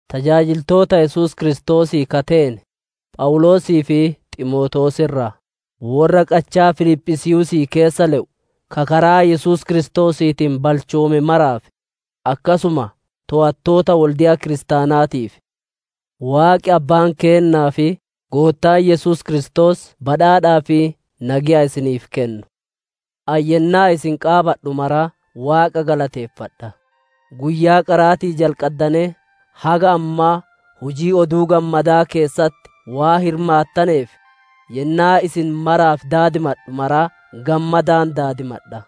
Tajaajiltoota Yesuus Kiristoosii ka teene Phawuloosii fi Ximootewoos irraa: Worra qachaa Filiphisiiyuusii keessa le'u, ka karaa Yesuus Kiristoosiitiin balchoome maraaf, akkasuma toowattootaa fi gargaartuu wolde'a kiristaanaatiif: Waaqi Abbaan keennaa fi Goottaan Yesuus Kiristoos badhaadhaa fi nageya isiniif kennu! Ani yennaa isin qaabadhu maraa Waaqa galateeffadha; Guyyaa qaraatii jalqaddanee haga ammaa hujii Oduu Gammadaa keessatti waan hirmaattaneef, yennaa isin maraaf daadimadhu maraa gammadaan daadimadha.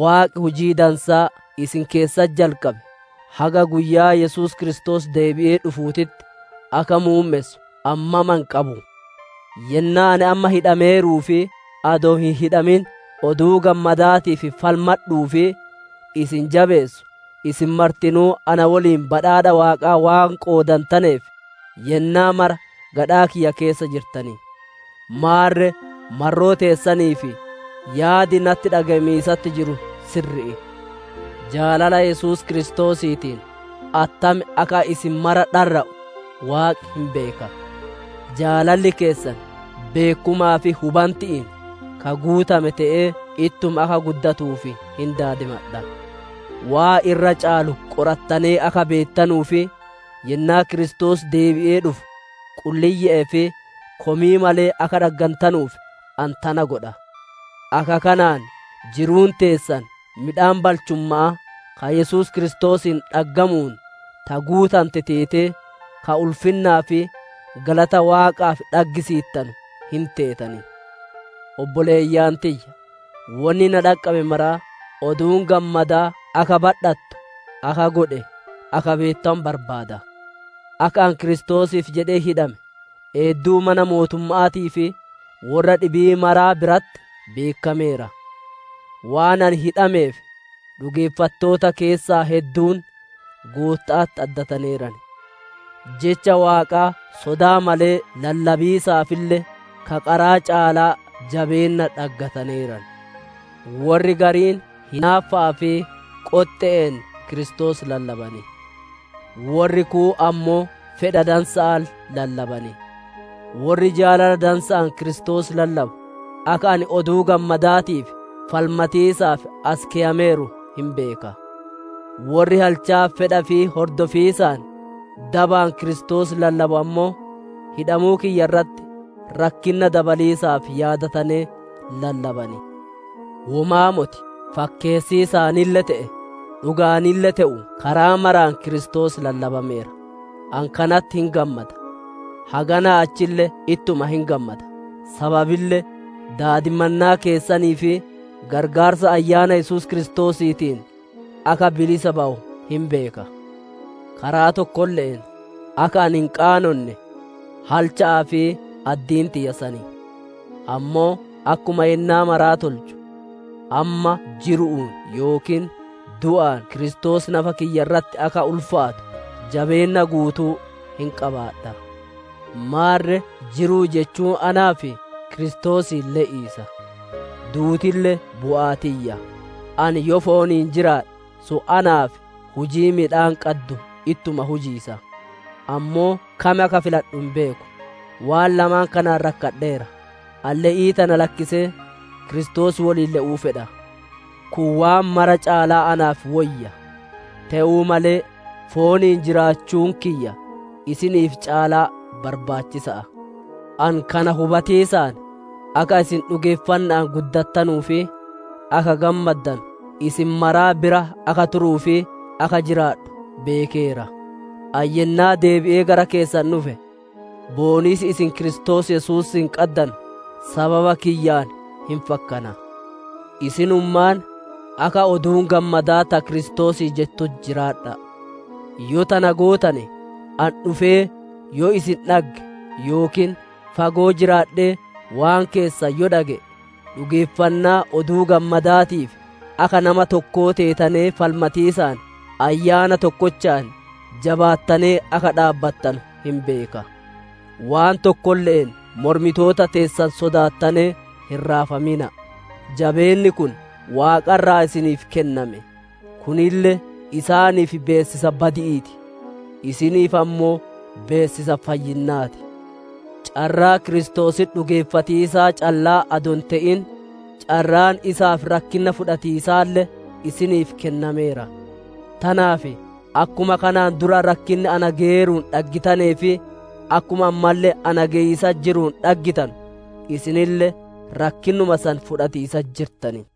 Waaqi hujii dansaa isin keessatti jalqabe, haga guyyaa Yesuus Kiristoos deebi'ee dhufuutitti, akka muummessu ani mama hin qabu. Yennaa ani amma hidhameeruu fi adoo hin hidhamin Oduu Gammadaatiif falmadhuu fi isii jabeessu, isin martinuu na woliin badhaadha Waaqaa waan qoodantaneef, yennaa mara gadhaa kiyya keessa jirtan. Maarre marroo teessaniif yaadi natti dhage'amiisatti jiru sirri'i. Jaalala Yesuus Kiristoosiitiin attam akka ani isin maraa dharra'u Waaqi hin beeka. Jaalalli keessan beekkumaa fi hubanti'iin ka guutame te'ee ittuma akka guddatuuf hin daadimadha. Waan irra caalu qorattanee akka beettanuu fi yennaa Kiristoos deebi'ee dhufu qulliyye'ee fi komii malee akka dhaggantanuuf ani tana godha. Akka kanaan jiruun teessan midhaan balchumma'aa, ka Yesuus Kiristoosiin dhaggamuun ta guutante teetee, ka ulfinnaa fi galata Waaqaaf dhaggisiittanu hin teetan. Obboleeyyan tiyya! Wonni na dhaqqabe maraa, Oduun Gammadaa akka badhattu akka godhe, akka beettanu barbaada. Akka ani Kiristoosiif jedhee hidhame, eedduu mana mootumma'aatii fi worra dhibii maraa biratti beekkameera. Waan ani hidhameef dhugeeffattoota keessaa hedduun Gootta'atti addataneeran; jecha Waaqaa sodaa malee lallabiisaafille ka qaraa caalaa jabeenna dhaggataneeran. Worri gariin hinaaffa'aa fi qoxxe'een Kiristoos lallaban; worri kuun ammoo fedha dansa'aan lallaban. Worri jaalala dansa'aan Kiristoos lallabu, akka ani Oduu Gammadaatiif falmatiisaaf as keyameeru hin beeka. Worri halchaa fedha ifii hordofiisaan dabaan Kiristoos lallabu ammoo, hidhamuu kiyya irratti rakkinna dabaliisaaf yaadatanee lallaban. Womaa moti! Fakkeessiisaanille te'ee, dhuga'aanille te'u karaa maraan Kiristoos lallabameera! Ani kanatti hin gammada. Haganaa achille ittuma hin gammada; sababille daadimannaa keessanii fi qarqaarsa Ayyaana Yesuus Kiristoosiitiin akka bilisa bawu hin beeka. Karaa tokkolle'een akka ani hin qaanonne, halcha'aa fi addiin tiyya san; ammoo akkuma yennaa maraa tolchu, amma jiru'uun yookiin du'aan Kiristoos nafa kiyya irratti akka ulfaatu jabeenna guutuu hin qabaadha. Maarre jiruu jechuun naaf Kiristoosiin le'iisa, duutille bu'aa tiyya. Ani yoo fooniin jiraadhe, sun naaf hujii midhaan qaddu ittuma hujiisa; ammoo kam akka filadhu hin beeku. Waan lamaan kanaan rakkadheera: ani le'ii tana lakkisee, Kiristoos woliin le'uu fedha; kun waan mara caalaa naaf woyya. Te'uu malee fooniin jiraachuun kiyya isiniif caalaa barbaachisa'a. Ani kana hubatiisaan, akka isin dhugeeffanna'aan guddattanuu fi akka gammaddanu, isin maraa bira akka turuu fi akka jiraadhu beekeera. Ani yennaa deebi'ee gara keessan dhufe, booniisi isin Kiristoos Yesuusiin qaddanu sababa kiyyaan hin fakkana. Isinummaan akka Oduun Gammadaa ta Kiristoosii jettutti jiraadha'a; tana yoo gootane, ani dhufee yoo isin dhagge yookiin fagoo jiraadhee waan keessan yoo dhage'e, dhugeeffannaa Oduu Gammadaatiif akka nama tokkoo teetanee falmatiisaan ayyaana tokkochaan jabaattanee akka dhaabbattanu hin beeka. Waan tokkolle'een mormitoota teessan sodaattanee hin raafamina'a! Jabeenni kun Waaqa irraa isiniif kenname; kunille isaaniif beessisa badi'ii ti; isiniif ammoo beessisa fayyinnaa ti. Carraa Kiristoositti dhugeeffatiisaa callaa adoo hin te'in, carraan isaaf rakkinna fudhatiisaalle, isiniif kennameera. Tanaaf akkuma kanaan dura rakkinni na geyeeruun dhaggitanee fi akkuma ammalle na geyiisatti jiruun dhageettanu, isinille rakkinnuma san fudhatiisatti jirtan.